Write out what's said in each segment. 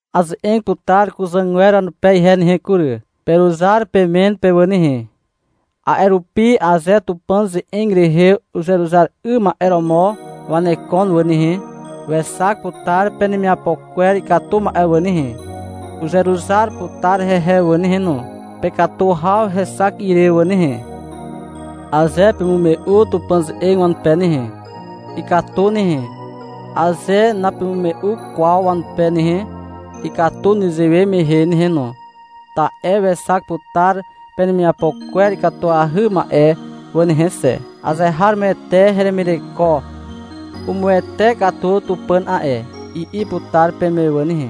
Aze'eg putar kuzàgwer wanupe ihe nehe kury. Peruzar pemen pe wà nehe. A'e rupi aze Tupàn ze'eg rehe uzeruzar 'ym ma'e romo wanekon wà nehe, wexak putar penemiapo kwer ikatu ma'e wà nehe, uzeruzar putar hehe wà nehe no, pekatu haw hexak ire wà nehe. Aze pemume'u Tupàn ze'eg wanupe nehe, ikatu nehe. Aze napemume'u kwaw wanupe nehe, ikatu nezewe mehe nehe no. Ta'e wexak putar penemiapo kwer ikatuahy ma'e wà nehe xe. — Azeharomoete heremireko umuwete katu Tupàn a'e, i'i putar peme wà nehe.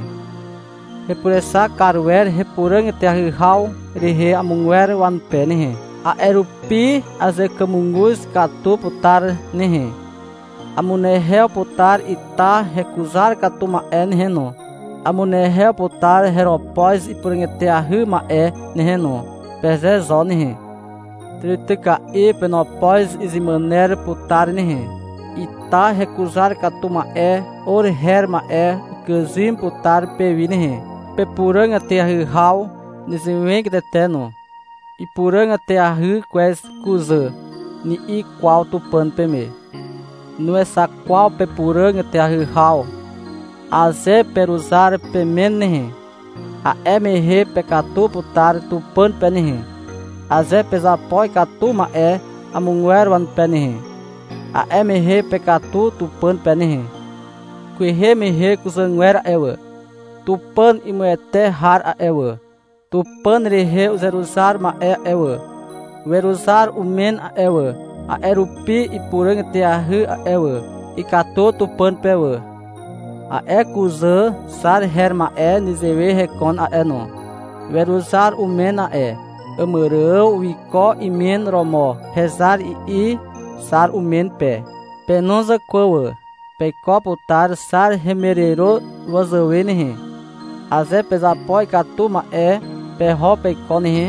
— Hepurexak kar wer hepuràg eteahy haw rehe amogwer wanupe nehe, a'e rupi azekàmuguz katu putar nehe, amunehew putar ita hekuzar katu ma'e nehe no, amunehew putar heropoz ipuràg eteahy ma'e nehe no, peze zo nehe. Tàrityka'i penopoz izemàner putar nehe. Ita hekuzar katu ma'e or her ma'e ukàzym putar pewi nehe. Pepuràg eteahy haw nezewegatete no. — Ipuràg eteahy kwez kuzà, ni'i kwaw Tupàn peme. Nuexak kwaw pepuràg eteahy haw. Aze peruzar pemen nehe, a'e mehe pekatu putar Tupàn pe nehe. Aze pezapo ikatu ma'e amogwer wanupe nehe, a'e mehe pekatu Tupàn pe nehe. Kwehe mehe kuzàgwer a'e wà, Tupàn imuwete har a'e wà, Tupàn rehe uzeruzar ma'e a'e wà, weruzar umen a'e wà. A'e rupi ipuràg eteahy a'e wà. Ikatu Tupàn pe wà. A'e kuzà Xar her ma'e nezewe hekon a'e no. Weruzar umen a'e. Àmàrààw wiko imen romo. — Hezar, i'i Xar umen pe. Pe no zàkwà wà. Peiko putar Xar hemiàriro wazàwe nehe, aze pezapo ikatu ma'e peho peiko nehe,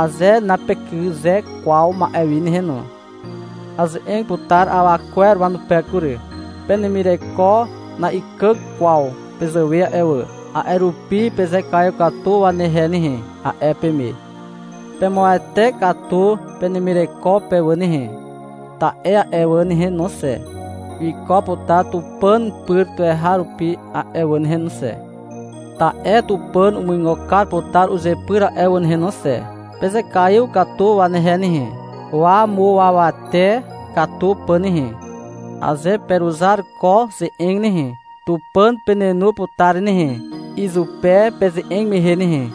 aze napekyze kwaw ma'e wi nehe no. Aze'eg putar awa kwer wanupe kury. Penemireko na'ikàg kwaw pezàwe a'e wà. A'e rupi, — Pezekaiw katu wanehe nehe, a'e peme. Pemuawate katu penemireko pe wà nehe. Ta'e a'e wà nehe no xe, wiko putar Tupàn pyr tuweharupi a'e wà nehe no xe. Ta'e Tupàn umuigo kar putar uzepyr a'e wà nehe no xe. Pezekaiw katu wanehe nehe, wamuawate katu pà nehe. Aze peruzar ko ze'eg nehe, Tupàn penenu putar nehe, izupe peze'eg mehe nehe.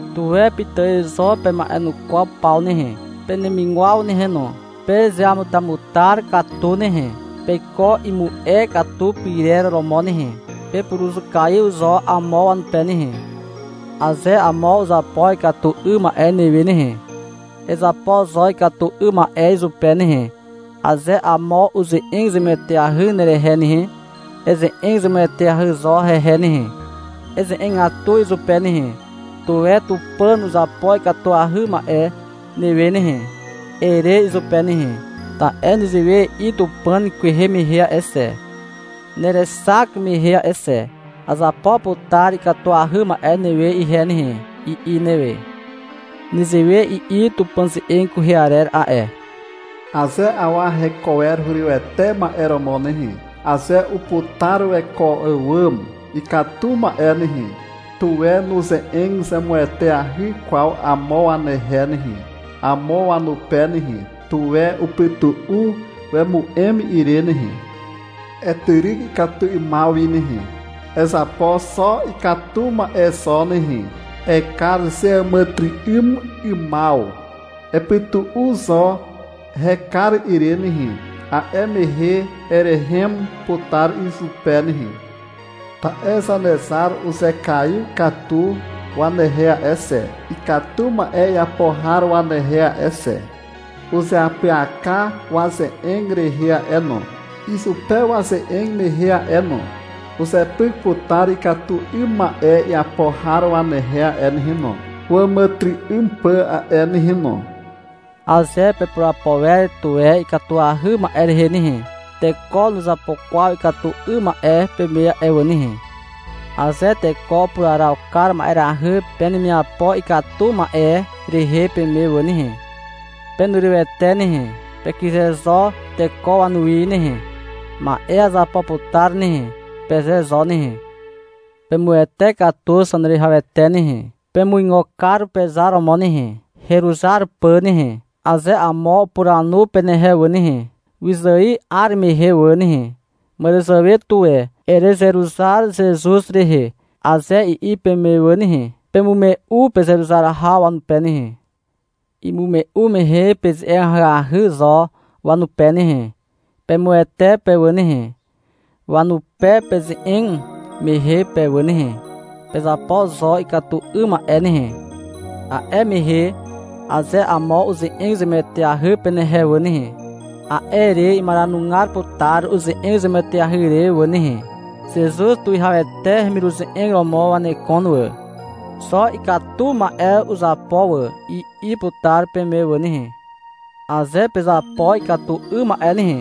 Tuwe pitài zo pema'enukwaw paw nehe, penemigwaw nehe no. Pezeamutamutar katu nehe. Peiko imu'e katu pyrer romo nehe, pepuruzukaiw zo amo wanupe nehe. Aze amo uzapo ikatu 'ym ma'e newe nehe, ezapo zo ikatu 'ym ma'e izupe nehe. Aze amo uze'eg zemueteahy nerehe nehe, eze'eg zemueteahy zo hehe nehe. Eze'egatu izupe nehe. — Tuwe Tupàn uzapo ikatuahy ma'e newe nehe, ere izupe nehe. Ta'e nezewe i'i Tupàn kwehe mehe a'e xe, nerexak mehe a'e xe. — Azapo putar ikatuahy ma'e newe ihe nehe, i'i newe. Nezewe i'i Tupàn ze'eg kwehe arer a'e. Aze awa heko wer hurywete ma'e romo nehe, Aze uputar weko àwàm ikatu ma'e nehe, Tuwe nuze'eg zemueteahy kwaw amo wanehe nehe, amo wanupe nehe. Tuwe upytu'u wemu'em ire nehe. Etyryk ikatu 'ymaw wi nehe. Ezapo xo ikatu ma'e zo nehe. Ekar zeàmàtyry'ym 'ymaw. Epytu'u zo hekar ire nehe. A'e mehe erehem putar izupe nehe. Ta'e Zanezar uzekaiw katu wanehe a'e xe, Ikatu ma'e iapo har wanehe a'e xe. Uzeapyaka waze'eg rehe a'e no, Izupe waze'eg mehe a'e no. Uzepyk putar ikatu 'ym ma'e iapo har wanehe a'e nehe no, Wàmàtyry'ym pà a'e nehe no. Aze pepurapo wer tuwe ikatuahy ma'e rehe nehe, teko nuzapo kwaw ikatu 'ym ma'e peme a'e wà nehe. Aze teko upuraraw kar ma'erahy penemiapo ikatu ma'e rehe peme wà nehe, penurywete nehe. Pekyze zo teko wanuwi nehe. Ma'e azapo putar nehe, peze zo nehe. Pemuwete katu Zaneruwihawete nehe. Pemuigo kar pezar romo nehe, heruzar pà nehe. Aze amo upuranu penehe wà nehe, wyzài 'ar mehe wà nehe, — Màràzàwe tuwe erezeruzar Zezuz rehe, aze i'i peme wà nehe, pemume'u pezeruzar haw wanupe nehe. Imume'u mehe peze'eg ahyahy zo wanupe nehe. Pemuwete pe wà nehe, wanupe peze'eg mehe pe wà nehe. Pezapo zo ikatu 'ym ma'e nehe. A'e mehe, aze amo uze'eg zemueteahy penehe wà nehe, a'e re imaranugar putar uze'eg zemueteahy re wà nehe. — Zezuz tuwihawete hemiruze'eg romo wanekon wà. Xo ikatu ma'e uzapo wà, i'i putar peme wà nehe. Aze pezapo ikatu 'ym ma'e nehe,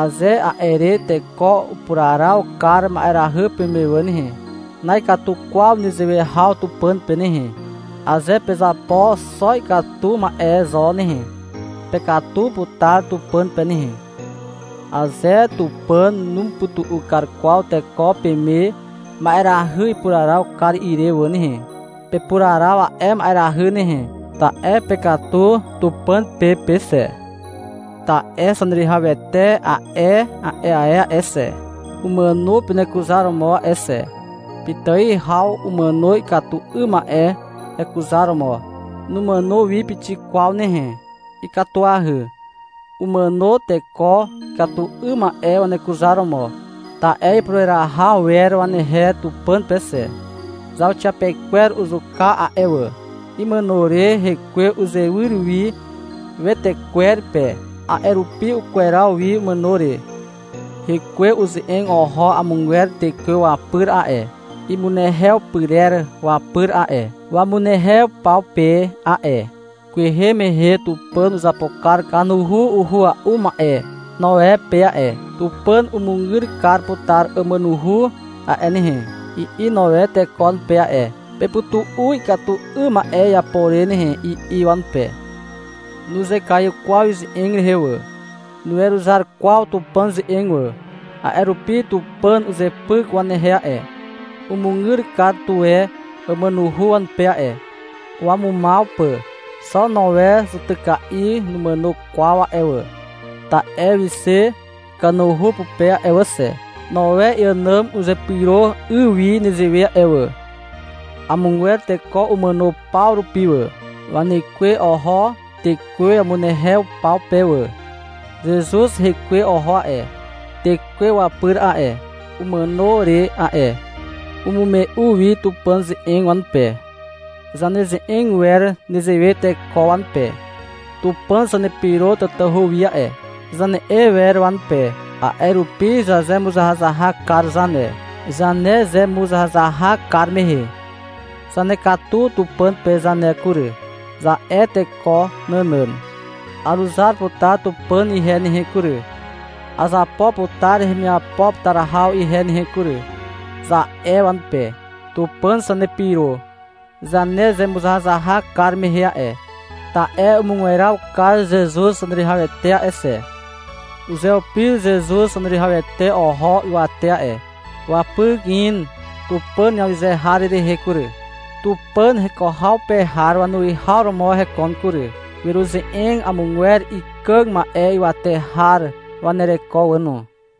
aze a'e re teko upuraraw kar ma'erahy peme wà nehe, na'ikatu kwaw nezewe haw Tupàn pe nehe. Aze pezapo xo ikatu ma'e zo nehe, pekatu putar Tupàn pe nehe. Aze Tupàn numupytu'u kar kwaw teko peme ma'erahy ipuraraw kar ire wà nehe, pepuraraw a'e ma'erahy nehe. Ta'e pekatu Tupàn pe pe xe. Ta'e Zaneruwihawete a'e ae a'e xe, umàno penekuzaromo a'e xe. Pitài haw umàno ikatu 'ym ma'e hekuzaromo. Numàno wi pixik kwaw nehe. Ikatuahy. Umàno teko ikatu 'ym ma'e wanekuzaromo. Ta'e ipureraha wer wanehe Tupàn pe xe. Zauxiapekwer uzuka a'e wà. Imàno re Hekwe uzewyr wi wetekwer pe. A'e rupi ukweraw wi umàno re. Hekwe uze'eg oho amogwer tekwe wapyr a'e, imunehew pyrer wapyr a'e, wamunehew paw pe a'e. Kwehe mehe Tupàn uzapo kar kanuhu uhua'u ma'e Noe pe a'e. — Tupàn umugyr kar putar àmànuhu a'e nehe, i'i Noe teko wanupe a'e. — Pepytu'u ikatu 'ym ma'e iapo re nehe, i'i wanupe. Nuzekaiw kwaw ize'eg rehe wà. Nuweruzar kwaw Tupàn ze'eg wà. A'e rupi Tupàn uzepyk wanehe a'e. Umugyr kar tuwe àmànuhu wanupe a'e, wamumaw pà. Xo Noe zutyka'i numàno kwaw a'e wà, ta'e wixe kanuhu pupe a'e wà xe. Noe iànàm uzepyro 'y wi nezewe a'e wà. Amogwer teko umàno paw rupi wà. Wanekwe oho tekwe wamunehew paw pe wà. Zezuz Hekwe oho a'e tekwe wapyr a'e, umàno re a'e. Umume'u wi Tupàn ze'eg wanupe. Zaneze'eg wer nezewe teko wanupe. — Tupàn zanepyro tatahu wi a'e, zane'e wer wanupe. A'e rupi zazemuzahazahak kar zane. Zanezemuzahazahak kar mehe, — Zanekatu Tupàn pe zane kury, za'e teko nànàn. — Aruzar putar Tupàn ihe nehe kury, azapo putar hemiapo putar haw ihe nehe kury, za'e wanupe. Tupàn zanepyro zanezemuzahazahak kar mehe a'e, ta'e umugweraw kar Zezuz Zaneruwihawete a'e xe. Uzeupir Zezuz Zaneruwihawete oho ywate a'e. Wapyk in Tupàn awyze har rehe kury. Tupàn heko haw pe har wanuwihaw romo hekon kury. Weruze'eg amogwer ikàg ma'e ywate har wanereko wà no.